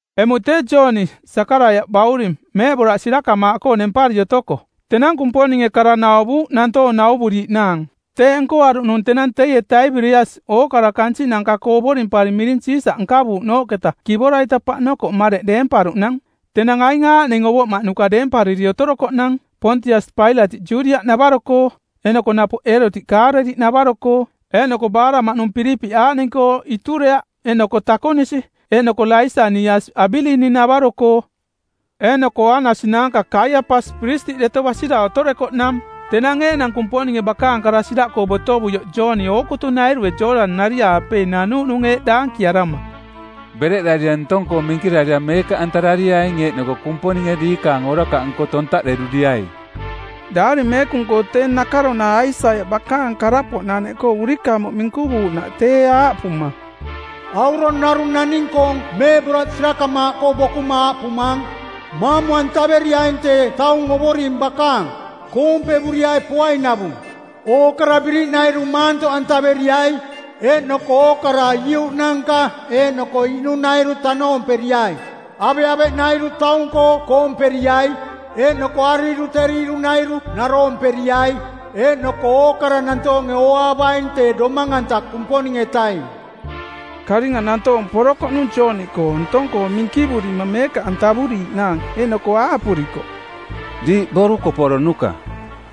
Emuꞌ tee Jooni, Sakaraiaꞌ bauring, meeꞌboraꞌ sirakamaaꞌkoo nempari otoko, tenang Kumponinge kara nauvuuꞌ nantoong nauvuriiꞌnaang. Teeꞌ nkoaruꞌnung tenang teie Taibiriasi ookara kansiꞌnanka-koo ovorimpari miring Siisaꞌ nkavuuꞌnooꞌketa kivora-ita paꞌnokoꞌ mareꞌ deemparuꞌnang. Tenang aing aaꞌning ovoꞌmaꞌnuka deempariri otorokoꞌnang: Poontiasi Pailatiꞌ Judiaꞌnavaro-koo, eeꞌnoko napoꞌ Eerotiꞌ Kaaleliꞌnavaro-koo, eeꞌnoko baaraꞌmaꞌnung Pilipiꞌ aaꞌning-koo Iturea, eeꞌnoko Takonisi, eeꞌnoko Laisaniasiꞌ Abilini-navaro-koo. Eeꞌnoko Aanasi naanka Kaiapasi piristiꞌ deto basira otorekoꞌnang; Tenang eeꞌnang Kumponinge bakaang kara siraꞌkoo botovuioꞌ Jooni ookutunairue Jooꞌdani-nari-aapei nanuuꞌnung eeꞌ daankiarama, “Bereꞌdarira ntong-koo minkirarira meekaꞌantarariaing eeꞌnoko Kumponinge diikaang orakaꞌnko tontaꞌderuriai.” Daari Meekung-koo tee nakaronara Aisaiaꞌ bakaang karapoꞌnaneꞌkoo urikamuꞌ minkuvuuꞌnaꞌ tee, aaꞌpuma, “Aurong narung naning-koong meeꞌboraꞌ sirakamaaꞌkoo bokuma aaꞌpumaang, ‘Maamu-antaveriaing tee taung Ovoring bakaang. Koompevuriai poainavung. Ookara biriꞌnairu maantoꞌantaveriai, Eeꞌnoko ookara iuꞌnanka eeꞌnoko iꞌnunairu tanoomperiai. Aveꞌaveꞌnairu taung-koo koomperiai, Eeꞌnoko ariiruteriirunairu naroomperiai. Eeꞌnoko ookara nantoonge ooaavaing tee Domang-anta Kumponing-etaing.’” Karinga nantoong porokoꞌnung Jooni-koo ntong-koo minkivurima meekaꞌantavuriiꞌnaang. Eeꞌnoko aaꞌpurikoꞌ, “Diiꞌ borukoporonuka,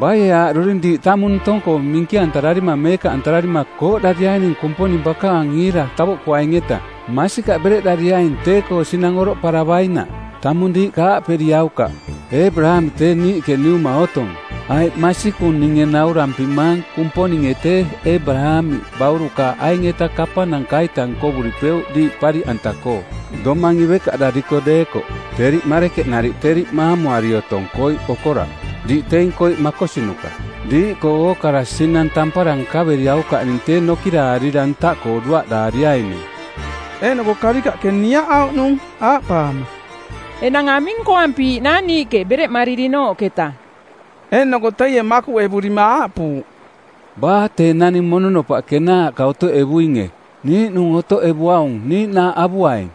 baie aaꞌduri diiꞌ tamung ntong-koo minkirarira meekaꞌantararima kooꞌdariaining Kumponing bakaang iira tavoꞌkuaing-eta? Masikaꞌ bereꞌdariaing tee-koo sinang oroꞌparavainaꞌ. Tamung diiꞌka aaꞌperiaukaꞌ, ‘Eebaraamiꞌ tee niiꞌke niuma otong,’ aiꞌ masikung ninge naurampimang Kumponinge tee Eebaraamiꞌ baurukaaꞌ aing-eta kapananka-ita nkovuripeuꞌ diiꞌ pariꞌanta-koo, domang ivekaꞌdariko deekoꞌ. Teriꞌ marekenariꞌ teriꞌ maamuari otong koiꞌkoo okoraꞌ. Diiꞌ teing koiꞌ makosinuka. Diiꞌkoo ookara sinang tampara nkaveriaukaꞌning tee nokiraarira ntaꞌkoo duaꞌdaariaining.” Eeꞌnoko karikaꞌke niaꞌauꞌnung, aaꞌpaama, “Enang aming nkoampiiꞌnaang niiꞌke bereꞌmaririnooꞌketa?” Eeꞌnoko teie makuꞌevurima aaꞌpuuꞌ, “Baa tee naning mononopaꞌ kenaaꞌka otoꞌevuinge niiꞌnung otoꞌevuaung niiꞌnaaꞌ avuaing.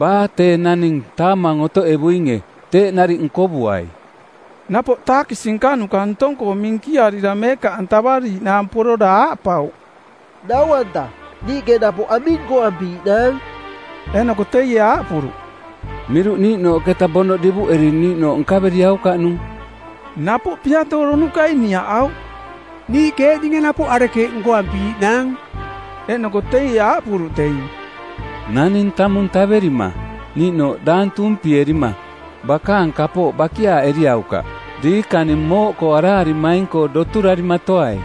Baa tee naning taamang otoꞌevuinge teeꞌ nariꞌ nkovuai.” Napoꞌ taakisi nkanuka ntong-koo minkiarira meekaꞌantavariiꞌnaang porora aaꞌpauꞌ, “Nau-anta, niiꞌke napoꞌ aming nkoampiiꞌnaang?” Eeꞌnoko teie aaꞌpuruꞌ, “Miruꞌniiꞌnooꞌketa bonoꞌ divuꞌeri niiꞌnooꞌ nkaveriaukaꞌnung.” Napoꞌ piatooronukai˜ niaꞌauꞌ, “Niiꞌke eeꞌninge napoꞌ, arekeeꞌ nkoampiiꞌnaang?” Eeꞌnoko teie aaꞌpuruꞌ teing, “Naning tamung taverima, niiꞌnooꞌ daang tuumpierima, bakaang kapooꞌ bakiaaꞌeriaukaꞌ. Diikaning mooꞌkoo araarimaing-koo doturarimatoai.”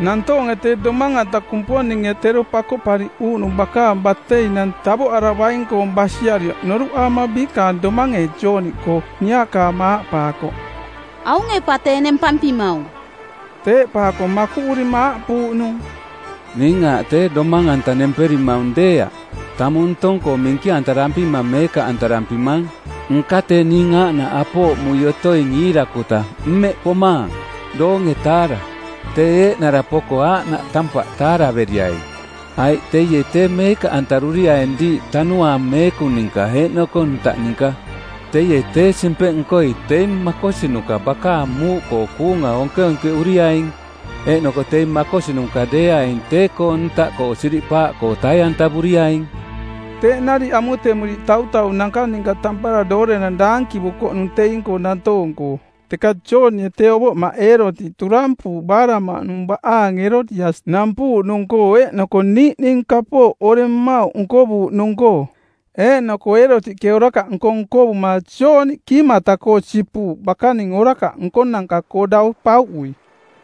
Nantoonge Tee Domang-anta Kumponinge tero Pakoꞌpariꞌuuꞌnung˜ bakaang bateinang tavoꞌaravaing-koong basiarioꞌ noruꞌaama biikaang domange Jooni-koo niaꞌkaama aaꞌpaakoꞌ, “Aunge pa tee nempampimaung.” Teeꞌpaako makuꞌurima aaꞌpuuꞌnung, “Ning aaꞌ tee Domang-anta nemperimaung deeaꞌ, tamung ntong-koo minkirampima meekaꞌantarampimaang, nka tee ning aaꞌnaꞌ apooꞌmui otoing iirakuta mmeꞌ pomaang, doonge-taara˜. Tee eeꞌnara poko aaꞌnaꞌ tampaꞌ taaraveriai, aiꞌ teie tee meekaꞌantaruriaing diiꞌ Tanuaang Meekung ninka eeꞌnoko ntaꞌ ninka. Teie, tee simpeꞌnkoi˜ teing makosinuka bakaang muuꞌkoo kuunga onkeonkeꞌuriaing, eeꞌnoko teing makosinuka deeaing tee-koo ntaꞌkoo siriꞌpaaꞌkoo tai-antavuriaing.” Teeꞌ nariꞌ amutemuriiꞌ tautaunanka ninka tampara doorenang daankivukoꞌnung teing-koo nantoong-koo. Teka Joonie tee ovoꞌmaꞌ Eerotiꞌ turampuuꞌ baaraꞌmaꞌnung baꞌaang Erodiasiꞌ nampuuꞌnung-koo eeꞌnoko niiꞌning kapooꞌ oreng mmauꞌ nkovuuꞌnung-koo. Eeꞌnoko Eerotiꞌke orakaꞌnko nkovuma Jooni kiimata-koo sipuuꞌ bakaning orakaꞌ nkonanka-koo dau pauꞌui.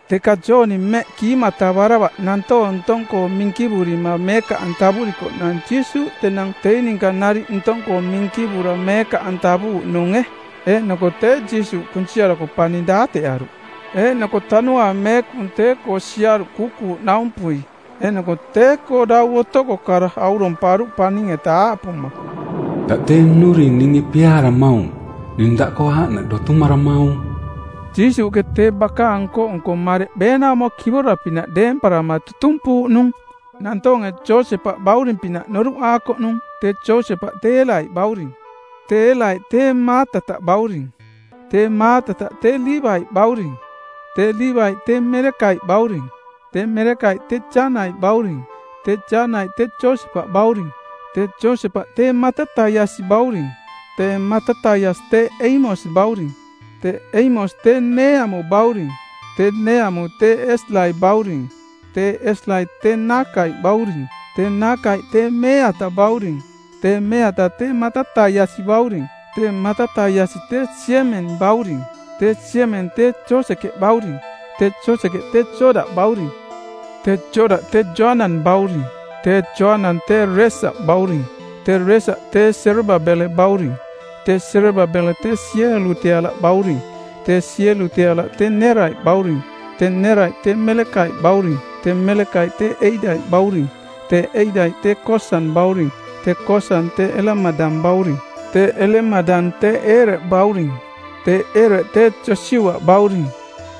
Teka Jooni mmeꞌ kiimatavaravaꞌ nantoong ntong-koo minkivurima meekaꞌantavurikoꞌnang Jiisuuꞌ tenang teing ninka nariꞌ ntong-koo minkivura meekaꞌantavuuꞌnunge. Eeꞌnoko tee Jiisuuꞌ kunsiarako paning daateꞌaruꞌ. Eeꞌnoko Tanuaang Meekung tee-koo siaruꞌ kuukuuꞌnaumpui, eeꞌnoko tee-koo dau otoko kara auromparuꞌ paning-eta aaꞌpuma, “Daꞌ tee nnuring ninge piaaramaung. Ning daꞌkoo aaꞌnaꞌ dotumaramaung.” Jiisuuꞌke tee bakaang nko-nko mareꞌ beenaumo kivora-pinaꞌ deemparama tutumpuuꞌnung. Nantoonge Josepaꞌ bauring-pinaꞌ noruꞌaakoꞌnung. Tee Josepaꞌ tee Eelaiꞌ bauring. Tee Eelaiꞌ tee Maatataꞌ bauring. Tee Maatataꞌ tee Liivaiꞌ bauring. Tee Liivaiꞌ tee Melekaiꞌ bauring. Tee Melekaiꞌ tee Janaiꞌ bauring. Tee Janaiꞌ tee Josepaꞌ bauring. Tee Josepaꞌ tee Matataiasiꞌ bauring. Tee Matataiasiꞌ tee Eimos bauring. Tee Eimos tee Neeamu bauring. Tee Neeamu tee Eslaiꞌ bauring. Tee Eslaiꞌ tee Naakaiꞌ bauring. Tee Naakaiꞌ tee Meeataꞌ bauring. Tee Meeataꞌ tee Matataiasiꞌ bauring. Tee Matataiasiꞌ tee Siemen bauring. Tee Siemen tee Josekeꞌ bauring. Tee Josekeꞌ tee Jodaꞌ bauring. Tee Jodaꞌ tee Joanang bauring. Tee Joanang tee Reesaꞌ bauring. Tee Reesaꞌ tee Serababele bauring. Tee Serababele tee Sieluteala bauring. Tee Sieluteala tee Neeraiꞌ bauring. Tee Neeraiꞌ tee Melekaiꞌ bauring. Tee Melekaiꞌ tee Eidaiꞌ bauring. Tee Eidaiꞌ tee Kosang bauring. Tee Kosang tee Elemadang bauring. Tee Elemadang tee Eere bauring. Tee Eere tee Josiuaꞌ bauring.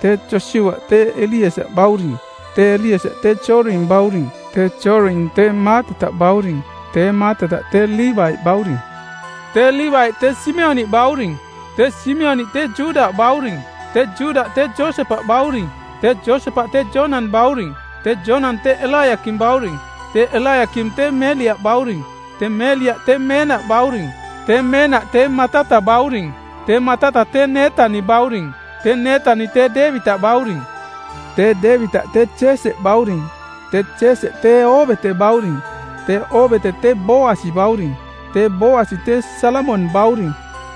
Tee Josiuaꞌ tee Eliesaꞌ bauring. Tee Eliesaꞌ tee Joring bauring. Tee Joring tee Maatataꞌ bauring. Tee Maatataꞌ tee Liivaiꞌ bauring. Tee Liivaiꞌ tee Simioniꞌ bauring. Tee Simioniꞌ tee Juda bauring. Tee Juda tee Josepaꞌ bauring. Tee Josepaꞌ tee Jonang bauring. Tee Jonang tee Elaiakim bauring. Tee Elaiakim tee Meliaꞌ bauring. Tee Meliaꞌ tee Meenaꞌ bauring. Tee Meenaꞌ tee Matataꞌ bauring. Tee Matataꞌ tee Neetani bauring. Tee Neetani tee Deevitaꞌ bauring. Tee Deevitaꞌ tee Jeeseꞌ bauring. Tee Jeeseꞌ tee Oobeteꞌ bauring. Tee Oobeteꞌ tee Booasi bauring. Tee Booasi tee Salamong bauring.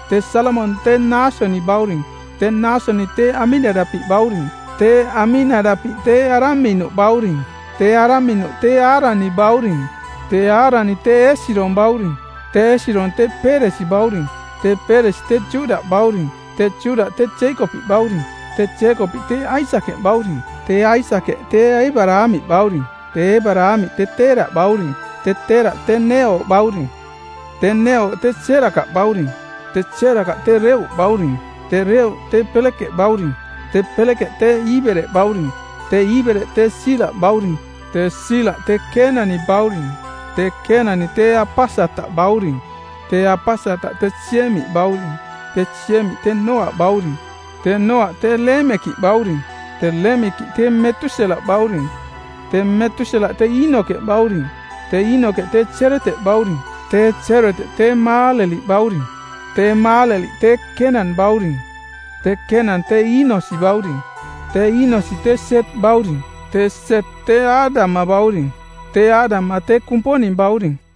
Tee Salamong tee Naasoni bauring. Tee Naasoni tee Aminadapiꞌ bauring. Tee Aminadapiꞌ tee Araminuꞌ bauring. Tee Araminuꞌ tee Aaraniꞌ bauring. Tee Aaraniꞌ tee Eesirong bauring. Tee Eesirong tee Peeresi bauring. Tee Peeresi tee Juda bauring. Tee Juda tee Jeekopiꞌ bauring. Tee Jeekopiꞌ tee Aisakeꞌ bauring. Tee Aisakeꞌ tee Eebaraamiꞌ bauring. Tee Eebaraamiꞌ tee Teeraꞌ bauring. Tee Teeraꞌ tee Neeoo bauring. Tee Neeoo tee Serakaꞌ bauring. Tee Serakaꞌ tee Reuꞌ bauring. Tee Reuꞌ tee Pelekeꞌ bauring. Tee Pelekeꞌ tee Iibereꞌ bauring. Tee Iibereꞌ tee Siilaꞌ bauring Tee Siilaꞌ tee Keenani bauring. Tee Keenani tee Apasataꞌ bauring. Tee Apasataꞌ tee Siemiꞌ bauring. Tee Siemiꞌ tee Nooaꞌ bauring. Tee Nooaꞌ tee Leemekiꞌ bauring. Tee Leemekiꞌ tee Metuselaꞌ bauring. Tee Metuselaꞌ tee Iinoke bauring. Tee Iinoke tee Jereteꞌ bauring. Tee Jereteꞌ tee Maaleliꞌ bauring. Tee Maaleliꞌ tee Kenan bauring. Tee Kenan tee Iinosiꞌ bauring. Tee Iinosiꞌ tee Set bauring. Tee Set tee Aadama bauring. Tee Aadama tee Kumponing bauring.